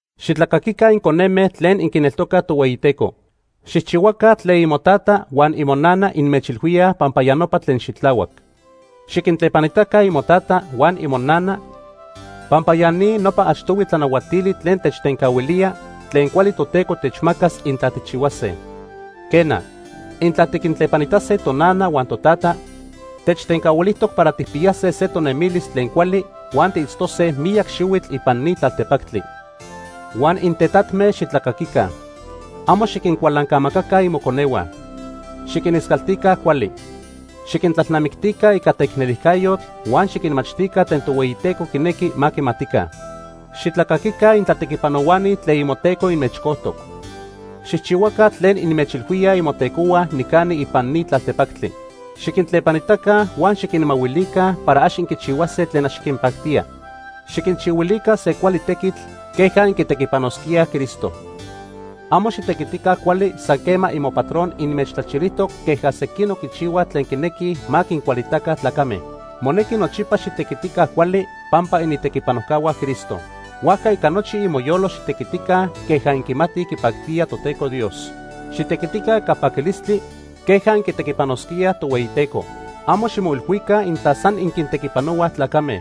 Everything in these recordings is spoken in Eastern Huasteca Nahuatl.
Xitlacaquica inconeme tlen inquineltocaj Tohueyiteco. Xijchihuaca tlen imotata huan imonana inmechilhuíaj pampa ya nopa tlen xitlahuac. Xiquintlepanitaca imotata huan imonana pampa ya ni nopa achtohui tlanahuatili tlen techtencahuilía tlen cuali Toteco techmacas intla tijchihuase. Quena, intla tiquintlepanitase tonana huan totata, techtencahuilijtoc para tijpiyase se tonemilis tlen cuali huan tiitztose miyac xihuitl ipan ni tlaltepactli. Huan intetatme, xitlacaquica. Amo xiquincualancamacaca imoconehua. Xiquiniscaltica cuali. Xiquintlalnamictica ica teicnelijcayotl huan xiquinmachtica tlen Tohueyiteco quinequi ma quimatica. Xitlacaquica intlatequipanohuani tlen imoteco inmechcojtoc. Xijchihuaca tlen inmechilhuíaj imotecohua nicani ipan ni tlaltepactli. Xiquintlepanitaca huan xiquinmahuilica para ax inquichihuase tlen ax quinpactía. Xiquinchihuilica se cuali tequitl queja inquitequipanosquíaj Cristo. Amo xitequitica cuali san quema imopatron inmechtlachilijtoc queja sequinoc quichihuaj tlen quinequij ma quincualitaca tlacame. Monequi nochipa xitequitica cuali pampa initequipanojcahua Cristo. Huajca ica nochi imoyolo xitequitica queja inquimatij quipactía Toteco Dios. Xitequitica ica paquilistli queja inquitequipanosquíaj Tohueyiteco. Amo ximoilhuica intla san inquintequipanohuaj tlacame.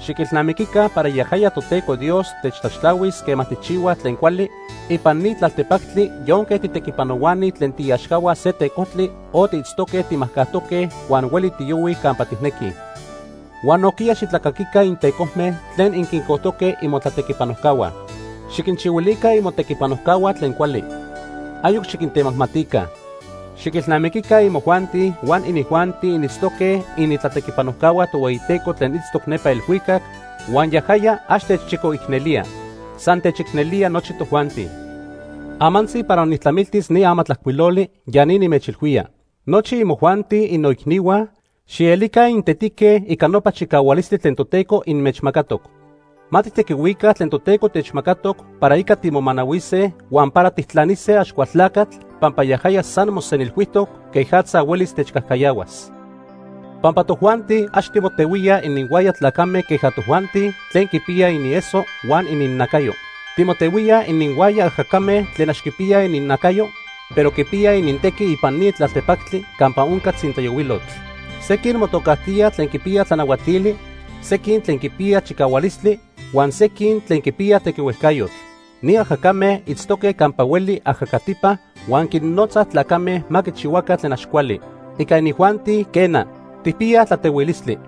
Xiquilnamiquica para yajaya Toteco Dios techtlaxtlahuis quema tijchihuaj tlen cuali ipan ni tlaltepactli yonque titequipanohuani tlen tiiaxcahua se tecojtli o tiitztoque timajcajtoque huan hueli tiyohuij campa tijnequij. Huan nojquiya xitlacaquica intecojme tlen inquincojtoque imotlatequipanojcahua. Xiquinchihuilica imotequipanojcahua tlen cuali. Ayoc xiquintemajmatica. Xiquilnamiquica imojuanti huan inijuanti initztoque initlatequipanojcahua Tohueyiteco tlen itztoc nepa elhuicac huan yajaya ax techchicoicnelía. San se techicnelía nochi tojuanti. Amantzi para nijtlamiltis ni amatlajcuiloli, ya ni nimechilhuía. Nochi imojuanti, innoicnihua, xielica intetique ica nopa chicahualistli tlen Toteco inmechmacatoc. Ma tijtequihuica tlen Toteco techmacatoc para ica timomanahuise huan para tijtlanise Axcualtlacatl pampa yajaya san mosenilhuijtoc quejatza huelis techcajcayahuas. Pampa tojuanti ax timotehuíaj ininhuaya tlacame queja tojuanti tlen quipiyaj inieso huan ininnacayo. Timotehuíaj ininhuaya ajacame tlen ax quipiyaj inintlacayo, pero quipiyaj inintequi ipan ni tlaltepactli campa onca tzintlayohuilotl. Sequin motocajtíaj tlen quipiyaj tlanahuatili, sequin tlen quipiyaj chicahualistli, huan sequin tlen quipiyaj tequihuejcayotl. Ni ajacame itztoque campa hueli ajacatipa huan quinnotzaj tlacame ma quichihuaca tlen ax cuali. Ica inijuanti, quena, tijpiyaj tlatehuilistli.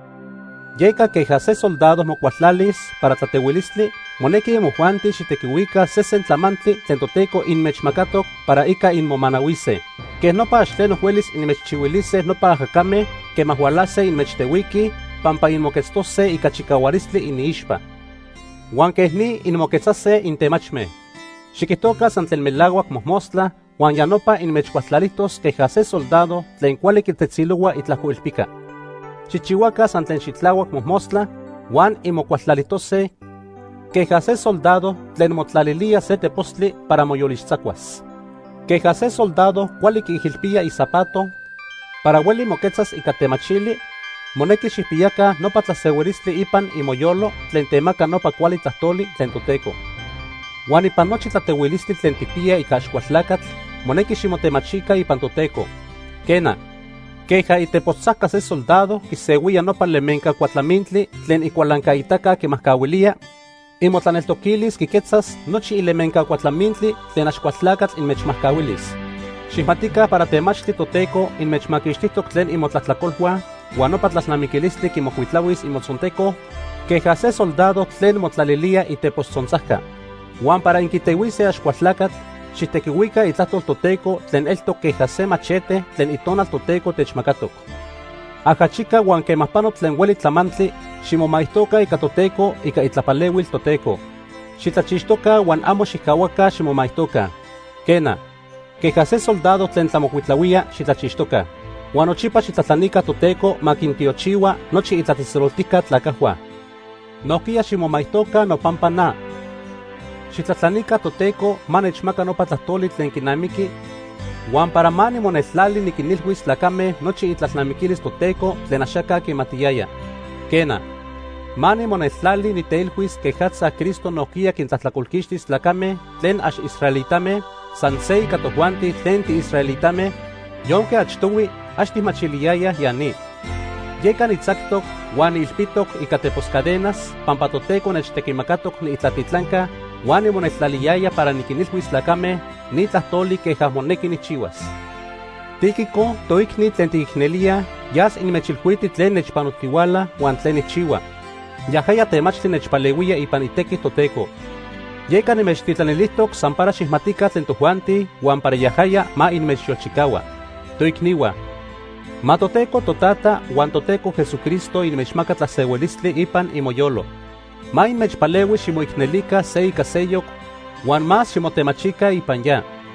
Yeca queja se soldado mocualtlalis para tlatehuilistli, monequi imojuanti xijtequihuica sesen tlamantli tlen Toteco inmechmacatoc para ica inmomanahuise. Quej nopa ax tleno huelis inmechchihuilise nopa ajacame quema hualase inmechtehuiquij pampa inmoquetztose ica chicahualistli iniixpa. Huan quej ni inmoquetzase intemachme. Xiquijtoca san tlen melahuac mojmostla huan ya nopa inmechcualtlalijtos queja se soldado tlen cuali quitetzilohua itlajcoilpica. Xijchihuaca san tlen xitlahuac mojmostla huan inmocualtlalijtose queja se soldado tlen motlalilía se tepostli para moyolixtzacuas. Queja se soldado cuali quiijilpía izapato para hueli moquetzas ica temachili, monequi xijpiyaca nopa tlasehuilistli ipan imoyolo tlen temaca nopa cuali tlajtoli tlen Toteco. Huan ipan nochi tlatehuilistli tlen tijpiya ica Axcualtlacatl, monequi ximotemachica ipan Toteco. Quena, queja itepostzajca se soldado quisehuía nopa lemenca cuatlamintli tlen icualancaitaca quimajcahuilía, imotlaneltoquilis quiquetzas nochi ilemenca cuatlamintli tlen Axcualtlacatl inmechmajcahuilis. Xijmatica para temachtli Toteco inmechmaquixtijtoc tlen imotlajtlacolhua huan nopa tlalnamiquilistli quimocuitlahuis imotzonteco queja se soldado tlen motlalilía itepostzontzajca. Huan para inquitehuise Axcualtlacatl, xijtequihuica Itlajtol Toteco tlen eltoc queja se machete tlen Itonal Toteco techmacatoc. Ajachica huan quema pano tlen hueli tlamantli, ximomaijtoca ica Toteco ica itlapalehuil Toteco. Xitlachixtoca huan amo xijcahuaca ximomaijtoca. Quena, queja se soldado tlen tlamocuitlahuía, xitlachixtoca. Huan nochipa xijtlajtlanica Toteco ma quintiochihua nochi itlatzejtzeloltijca tlacajhua. Nojquiya ximomaijtoca nopampa na. Xijtlajtlanica Toteco ma nechmaca nopa tlajtoli tlen quinamiqui huan para ma nimoneltlali niquinilhuis tlacame nochi itlalnamiquilis Toteco tlen axaca quimatiyaya. Quena, ma nimoneltlali niteilhuis quejatza Cristo nojquiya quintlajtlacolquixtis tlacame tlen ax israelitame san se ica tojuanti tlen tiisraelitame yonque achtohui ax tijmachiliyayaj ya ni. Yeca nitzactoc huan niilpitoc ica tepos cadenas pampa Toteco nechtequimacatoc niitlatitlanca huan nimoneltlaliyaya para niquinilhuis tlacame ni tlajtoli queja monequi nijchihuas. Tíquico, toicni tlen tiquicnelíaj yas inmechilhuiti tlen nechpanotihuala huan tlen nijchihua. Yajaya temachtli nechpalehuía ipan itequi Toteco. Yeca nimechtitlanilijtoc san para xijmatica tlen tojuanti huan para yajaya ma inmechyolchicahua. Toicnihua, ma Toteco Totata huan Toteco Jesucristo inmechmaca tlasehuilistli ipan imoyolo. Ma inmechpalehui ximoicnelica se ica seyoc huan más ximotemachica ipan ya.